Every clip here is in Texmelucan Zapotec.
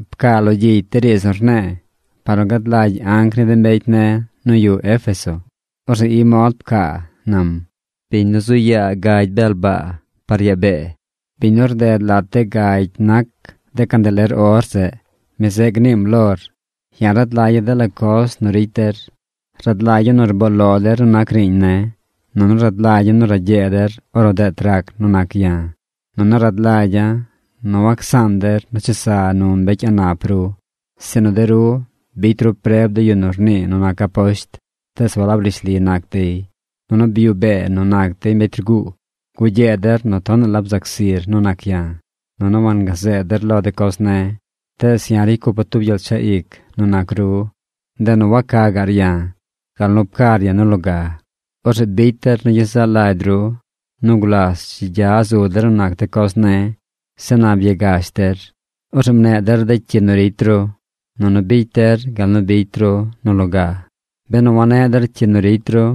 ’Pcaa lo gyicy de riidz nu rne̱e̱ par nu gad lagy anc ni de mbecy ne̱ nu yuꞌ Éfeso. Orzeꞌ i mod pcaa nam: “Biñ nu zu yaa gagy bel baa par yaa bee, biñ nu rded lat de gagy nac de candeler or zeꞌ, mi zeꞌ gniim lor: Ya̱ rad lagya̱ dela coz nu ricy der. Rad lagya̱ nu rboo lo der nu nac riiñ ne̱, nunu rad lagya̱ nu ragyee der ornu deet rac nu nac ya̱. Nunu rad lagya̱ nu wacsaan der nu chesa nu mbecy a̱ꞌ nap ru. Sinu de ru bicy ru preb de yu nu rnii nu nac aposht, tees walab rishli nac dey, nunu byuꞌ bee nu nac dey mbecy rguu. Gugyee der nu tonaꞌ la bzac zir nu nac ya̱, nunu wangazeed der lo de coz ne̱. Tees ya̱ ricy cupa̱ tub gyel chaꞌ ic nu nac ru. Ndeꞌ nu waca gaꞌr ya̱ gal nu pcar ya̱ nu loga. Orzeꞌ bicy der nu gyezaꞌ lagy ru nu gulas dzi gya zu der nu nac de coz ne̱. Zeꞌ na byagash der. Orzeꞌ mneꞌ der de cyi nu ricy ru, nunu bicy der gal nu bicy ru nu loga. Benu waneꞌ der cyi nu ricy ru,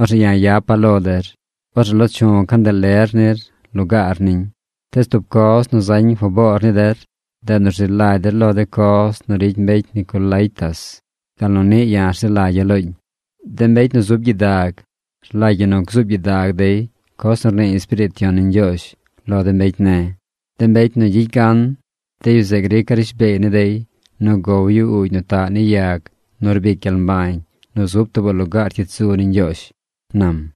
orzeꞌ ya̱ yapa̱ lo der. Orzeꞌ lo chu̱ candeler nir lugaar niñ. Tees tub coz nu zañ faboor ni der. Ndeꞌ nu rzi lagy der lo de coz nu ricy mbecy Nicolaítas gal nu niꞌ ya̱ rzi lagya̱ looñ. ¡De mbecy nu zub gyidag rlagy ñi nu gzuub gyidag dey coz nu rnii Espiriit Yon ni Ñgyoozh lo de mbecy ne̱! De mbecy nu gyicy gan, de yu zeꞌ grica̱ rishbeey ni dey nu gow yu uugy nu taꞌ ni yag nu rbic gyel mbañ nu zub tuubaꞌ lugaar cyit zu ni Ñgyoozh” ―nam―.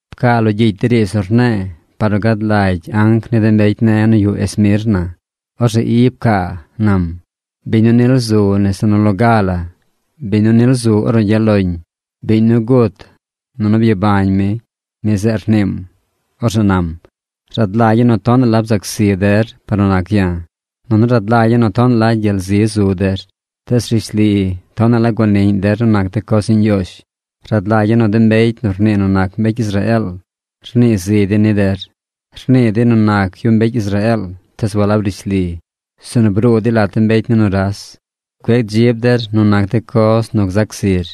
’Pcaa lo gyicy de riidz nu rne̱e̱ par nu gad lagy anc ni de mbecy ne̱ nu yuꞌ Esmirna. Orzeꞌ i pcaa nam: “Biñ nu nil zu nese nu loga la, biñ nu nil zu ornu gyaꞌ loñ, biñ nu gut, nunu byabañ mi, mi zeꞌ rniim, orzeꞌ nam: Rad lagya̱ nu tonaꞌ la bzac zi der par nu nac ya̱, nunu rad lagya̱ nu tonaꞌ la gyel zi zu der. Tees rishli, tonaꞌ la guaniꞌñ der nu nac de coz ni Ñgyoozh. Rad lagya̱ nu de mbecy nu rnii nu nac mbecy Israeel rnii zi dey ni der. Rnii dey nu nac yu mbecy Israeel tees walab rishli, sinu bruu dey lat de mbecy ni nuras. Cueꞌ dzib der nu nac de coz nu gzac zir.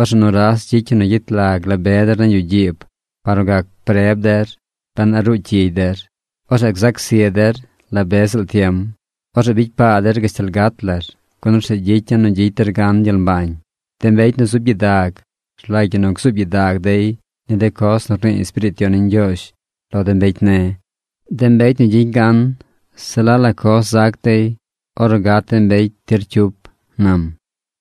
Orzeꞌ nuras gyicy yu nu gyet lag la be der nañ yuꞌ gyiib par nu gac preb der ben a ruu cyigy der. Orzeꞌ gzac zi der la be ziꞌl tiem. Orzeꞌ bicy paa der gashtal gat lar, gun orzeꞌ gyicya̱ nu gyicy der gan gyel mbañ. ¡De mbecy nu zub gyidag rlagy ñi nu gzuub gyidag dey ni de coz nu rnii Espiriit Yon ni Ñgyoozh lo de mbecy ne̱! De mbecy nu gyicy gan, se la la coz zac dey ornu gat de mbecy tir cyup” ―nam―.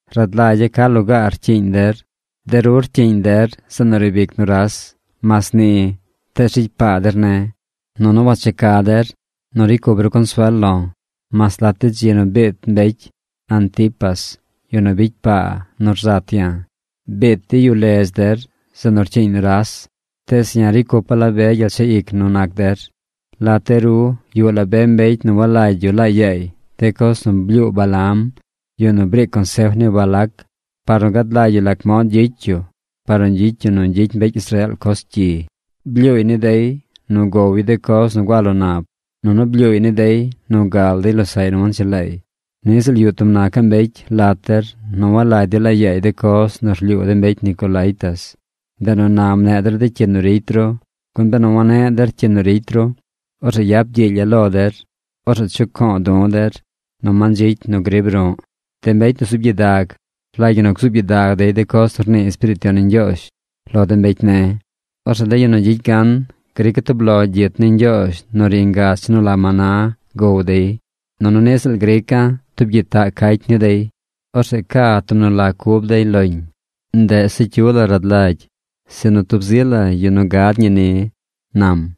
Rad lagya̱ ca lugaar rcyiiñ der. De ru rcyiiñ der zeꞌ nu riib ic nuras. Mas ni, tees ricy paa der ne̱. Nunu wacheca der nu ricy cup ru consuel lo̱ mas lat de dzi nu biit mbecy Antipas, yu nu bicy paa nu rzat ya̱. Biit dey yu ledz der, zeꞌ nu rcyiiñ nuras. Tees ya̱ ricy cupa̱ la be gyel chaꞌ ic nu nac der. Lat de ru yuꞌ la be mbecy nu walagy yu laa yaay de coz nu blyuu Balaam, yu nu briic consef ni Balac par nu gad lagy yu lac mod gyicy yu par nu gyicy yu nu gyicy mbecy Israeel coz cyi. Blyuuy ni dey nu gow yu de coz nu gua lo nab, nunu blyuuy ni dey nu gal dey losaꞌy nu wanchelaay. Ni ziꞌl yuꞌ tub nacaꞌ mbecy lat der nu walagy dey laa yaay de coz nu rlyuu de mbecy Nicolaítas. Ndeꞌ nu na mneꞌ der de cyi nu ricy ru. Gun benu waneꞌ der cyi nu ricy ru, orzeꞌ yap gyiilya̱ lo der. Orzeꞌ chuco̱o̱ du̱ der nu mandzicy nu grib ru̱ꞌ. ¡De mbecy nu zub gyidag, rlagy ñi nu gzuub gyidag dey de coz nu rnii Espiriit Yon ni Ñgyoozh lo de mbecy ne̱! Orzeꞌ de yu nu gyicy gan grica̱ tub lo gyit ni Ñgyoozh nu ri ngach nu la maná gow dey. Nunu niꞌ ziꞌl grica̱ tub gyitaꞌ cacy ni dey. Orzeꞌ ca tub nu la cub dey loñ. Ndeꞌ se cyu la rad lagy, sinu tub zi la yu nu gad ñi ni” ―nam―.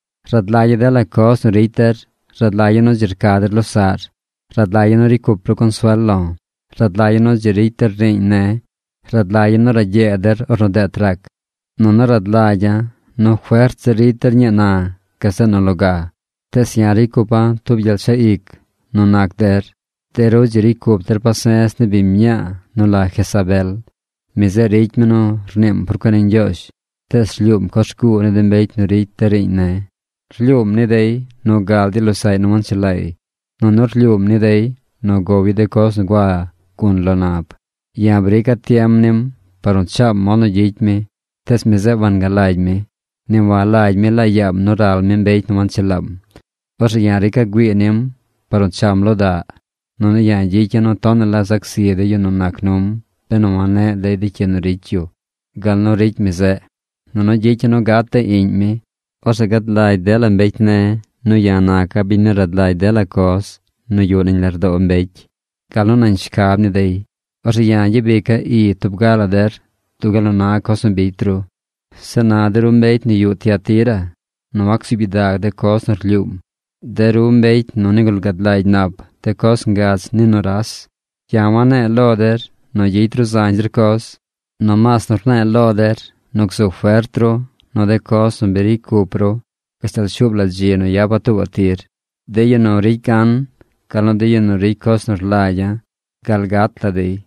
Rad lagya̱ dela coz nu ricy der. Rad lagya̱ nu dzi rca der losaꞌr. Rad lagya̱ nu ricy cup ru consuel lo̱. Rad lagya̱ nu dzi ricy der riiñ ne̱. Rad lagya̱ nu ragyee der ornu deet rac. Nunu rad lagya̱ nu fert zir ricy der ñii na gazeꞌ nu loga. Tees ya̱ ricy cupa̱ tub gyel chaꞌ ic nu nac der. De ru dzi ricy cup der pase̱z ni biñ mñaa nu la Jezabel. Mi zeꞌ ricy mi nu rniim por cuen ni Ñgyoozh, tees rlyuum coz rguu ni de mbecy nu ricy de riiñ ne̱. Rlyuum ni dey nu gal dey losaꞌy nu wanchelaay. Nunu rlyuum ni dey nu gow yu de coz nu gua gun lo nab. Ya̱ brica̱ tiem nim par nu chaam mod nu gyicy mi, tees mi zeꞌ wangalagy mi. Ni walagy mi laa yaam nu ral mi mbecy nu wanchelaam. Orzeꞌ ya̱ rica̱ güii nim par nu cham lo daꞌ. Nunu ya̱ gyicya̱ nu tonaꞌ la zac zi de yu nu nac num benu waneꞌ dey cyi nu ricy yu gal nu ricy mi zeꞌ. Nunu gyicya̱ nu gat de Iꞌñ mi. Orzeꞌ gad lagy dela mbecy ne̱ nu ya̱ naca̱ biñ nu rad lagy dela coz nu yuꞌ nañ lardoo mbecy, gal nu nañ shcab ni dey. Orzeꞌ ya̱ gyabica̱ i tub ga la der dub gal nu na coz nu bicy ru. Zeꞌ na de ru mbecy nu yuꞌ Tiatira nu wacsuub gyidag de coz nu rlyuum, de ru mbecy nu nigul gad lagy nap de coz ngach ni nuras, ya̱ wane̱e̱ lo der nu gyicy ru zañ zir coz. Nomaas nu rne̱e̱ lo der nu gzu fert ru nu de coz nu bi ricy cup ru gashtal shuub la dzi nu yapa̱ tuubaꞌ tir. De yu nu ricy gan, gal nu de yu nu ricy coz nu rlagya̱ gal gat la dey,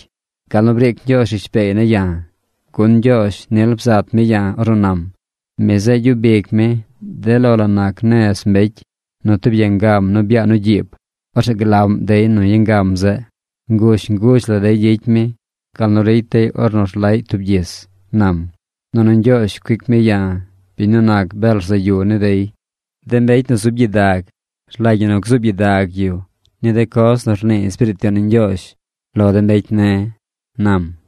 gal nu briic Ñgyoozh rishbeey ne̱ ya̱. Gun Ñgyoozh nil bzat mi ya̱ ornu nam: Mi zeꞌ gyub ic mi de lo la nac nez mbecy nu tub yangam nu byaa nu gyiib. Orzeꞌ glaꞌm dey nu yangam zeꞌ. Nguzh nguzh la dey gyicy mi gal nu ricy dey ornu rlaꞌy tub gyis, nam. Nunu Ñgyoozh cuic mi ya̱, biñ nu nac bel rzaꞌ yu, ni dey. ¡De mbecy nu zub gyidag, rlagy ñi nu gzuub gyidag yu ni de coz nu rnii Espiriit Yon ni Ñgyoozh lo de mbecy ne̱!” ―nam―.